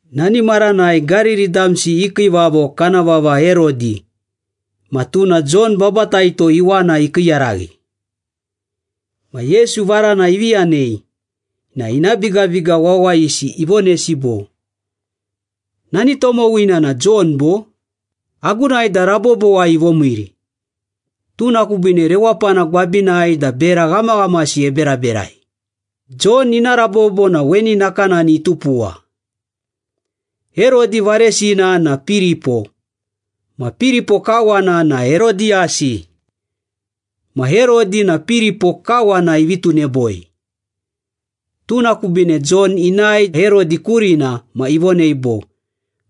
Nani maranai Gariri damsi i kiivavo kana vava Herodi ma tuna Jon Babataito iwana ikiiyaraghi. Ma Yesu varana ivi yanei, na ina bigabiga wawayisi ivonesi bo, “Nani tomowina na Jon bo? Agunai da rabobowai ivomiiri. Tuna kubiine rewapana gwabinai da bera ghamaghamasi eberaberai.” Jon ina rabobo na weni nakanani itupuwa. Herodi varesina na Piripo ma Piripo kawana na Herodiyasi. Ma Herodi na Piripo kawana ivi tuneboi. Tuna kubiine Jon inae Herodi kurina ma ivonei bo,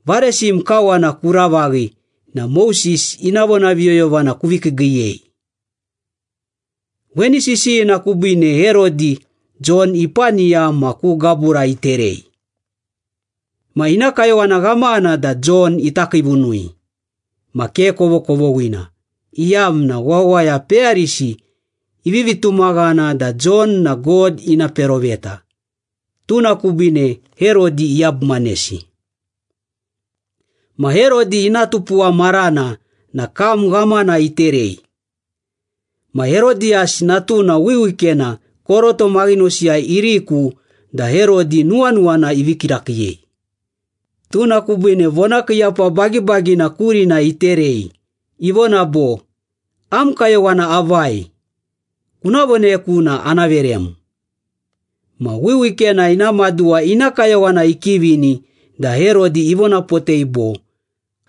“Varesim kawana kuravaghi na Moses ina vonaviyoyovana kuvi kiigiiyei.” Weni sisiyina kubiine Herodi, Jon ipaniya ma ku gabura iterei. Ma ina kayowana ghamana da Jon ita kiivunui. Ma ke kovokovoghina, iyamna wawaya peyarisi ivivi tumaghana da Jon na God ina peroveta, tuna kubiine Herodi iyabumanesi. Ma Herodi ina tupuwa marana na kam ghamana iterei. Ma Herodiyasi natuna wiwikena koroto maghinosiyai iriku da Herodi nuwanuwana ivii kirakiiyei. Tuna kubiine vonakiiyapa bagibagina kurina iterei, ivona bo, “Am kayowana avai, kuna voneku na ana verem.” Ma wiwikena ina maduwa ina kayowana ikivini da Herodi ivonapotei bo,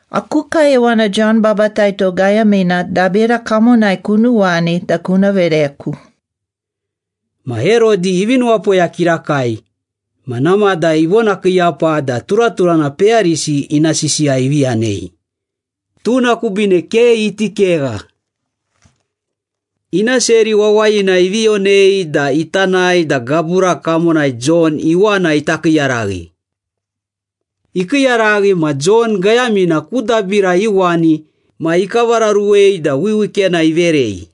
“Aku kayowana Jon Babataito gayamina dabira kamonai kunuwani da kuna vereku.” Ma Herodi ivi nuwapoya kirakai, ma namada ivonakiiyapa da turaturana peyarisi ina sisiya ivi yanei, tuna kubiine ke iti kegha. Ina seri wawayina ivi yonei da ita nae da gabura kamonai Jon iwana ita kiiyaraghi. Ikiiyaraghi ma Jon gayamina ku dabira iuwani ma ikavararuwei da wiwikena iverei.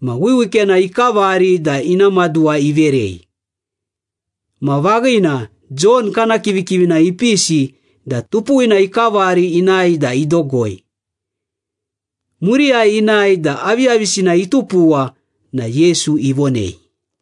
Ma wiwikena ikavari da ina maduwa iverei. Ma vaghina, Jon kana kivikivina ipisi da tupuwina ikavari inae da idogoi. Muriyai inae da aviyavisina itupuwa na Yesu ivonei.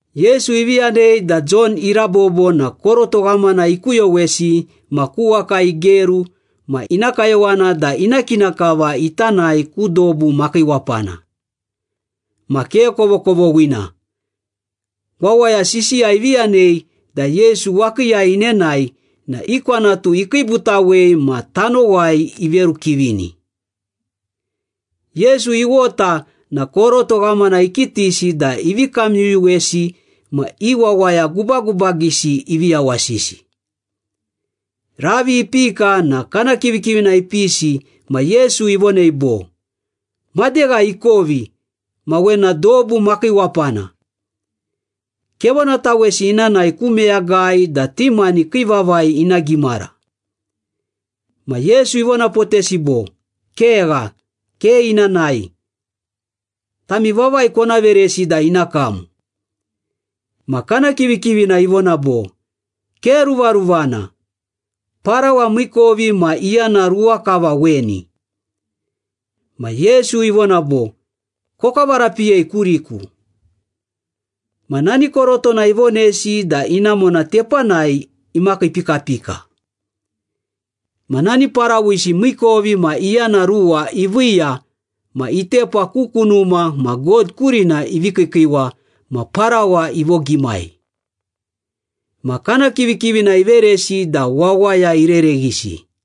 Yesu ivi yanei da Jon irabobo na koroto ghamana ikuyowesi ma ku waka igeru ma ina kayowana da ina kina kava ita nae ku dobu makiiwapana. Ma ke kovokovoghina, wawaya sisiya ivi yanei da Yesu wakiiyai inenae na i kwanatu ikiibutawei ma tanowai iverukivini. Yesu iwota na koroto ghamana ikitisi da ivi kamyuyuwesi ma i wawaya gubagubagisi ivi yawasisi. Ravi ipika na kana kivikivina ipisi ma Yesu ivonei bo, “Madegha ikovi ma wena dobu makiiwapana. Kevonatawesi ina nae ku meyagai da ti mani kii vavai ina gimara.” Ma Yesu ivonapotesi bo, “Kegha, ke ina nae. Tami vavai kona veresi da ina kam.” Ma kana kivikivina ivona bo, “Ke ruvaruvana! Parawa miikovi ma iyana ruwa kava weni.” Ma Yesu ivona bo, “Kokavarapiyei kuriku.” Ma nani korotona ivonesi da inamona tepanai imakiipikapika. Ma nani parawisi miikovi ma iyana ruwa iviiya ma itepa ku kunuma ma God kurina ivi kiikiiwa ma parawa ivogimai. Ma kana kivikivina iveresi da wawaya irereghisi.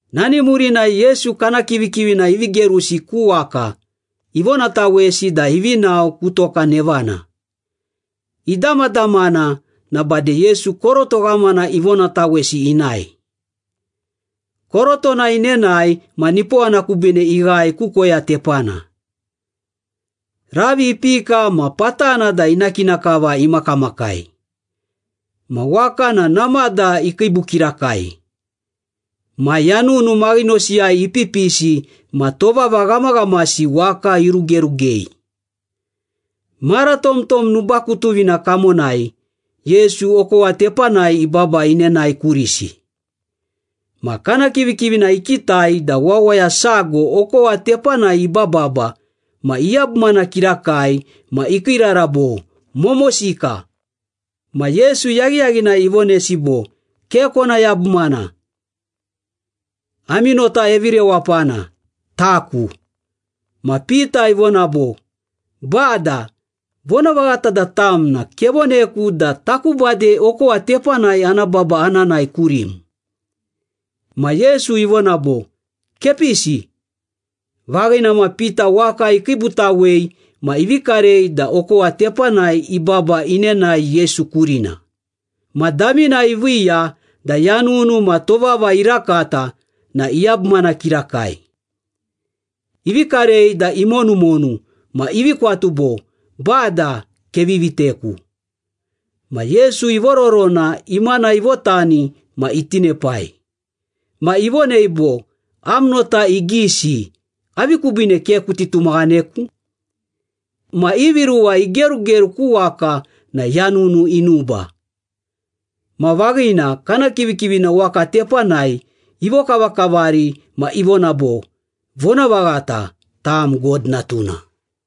Nani murinai Yesu kana kivikivina ivi gerusi ku waka, ivonatawesi da ivi nao ku toka nevana. Idamadamana na bade Yesu koroto ghamana ivonatawesi inae. Korotona inenae ma nipowana kubiine ighae ku koya tepana. Ravi ipika ma patana da ina kina kava imakamakai, ma waka na namada ikiibu kirakai. Ma yanunu maghinosiyai ipipisi ma tovava ghamaghamasi waka irugerugei. Mara tomtom nubakutuvina kamonai, Yesu okowa tepanai ibaba inenae kurisi. Ma kana kivikivina ikitai da wawaya sago okowa tepanai ibababa ma iyabumana kirakai ma ikiirara bo, “Momosika!” Ma Yesu yaghiyaghinai ivonesi bo, “Ke kona yabumana, ami nota evirewapana. Taku.” Ma Pita ivona bo, “Bada, vonavaghata da tam na kevoneku da taku bade okowa tepanai ana baba ana nae kurim.” Ma Yesu ivona bo, “Kepisi.” Vaghina ma Pita waka ikiibutawei ma ivi karei da okowa tepanai ibaba inenae Yesu kurina, ma damina iviiya da yanunu ma tovava irakata na iyabumana kirakai. Ivi karei da imonumonu ma ivi kwatu bo, “Bada, kevi viteku!” Ma Yesu ivororona, imana ivotani ma itinepai. Ma ivonei bo, “Am nota igisi, avi kubiine ke kuti tumaghaneku?” Ma ivi ruwa igerugeru ku waka na yanunu inuba. Ma vaghina, kana kivikivina waka tepanai ivokavakavari ma ivona bo, “Vonavaghata, tam God Natuna.”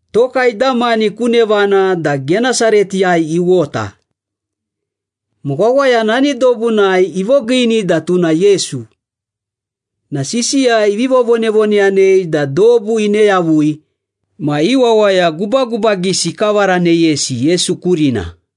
Toka idamani ku nevana da Genesaretiyai iwota. Ma wawaya nani dobunai ivogiini da tuna Yesu na sisiya ivi vovonavoneyanei da dobu ine yavui ma i wawaya gubagubagisi ikavaraneyesi Yesu kurina.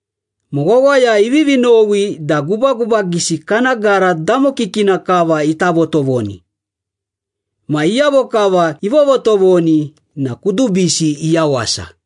Ma wawaya ivivi nowi da gubagubagisi kana gara damokikina kava ita votovoni. Ma iyavo kava ivovotovoni na kudubisi iyawasa.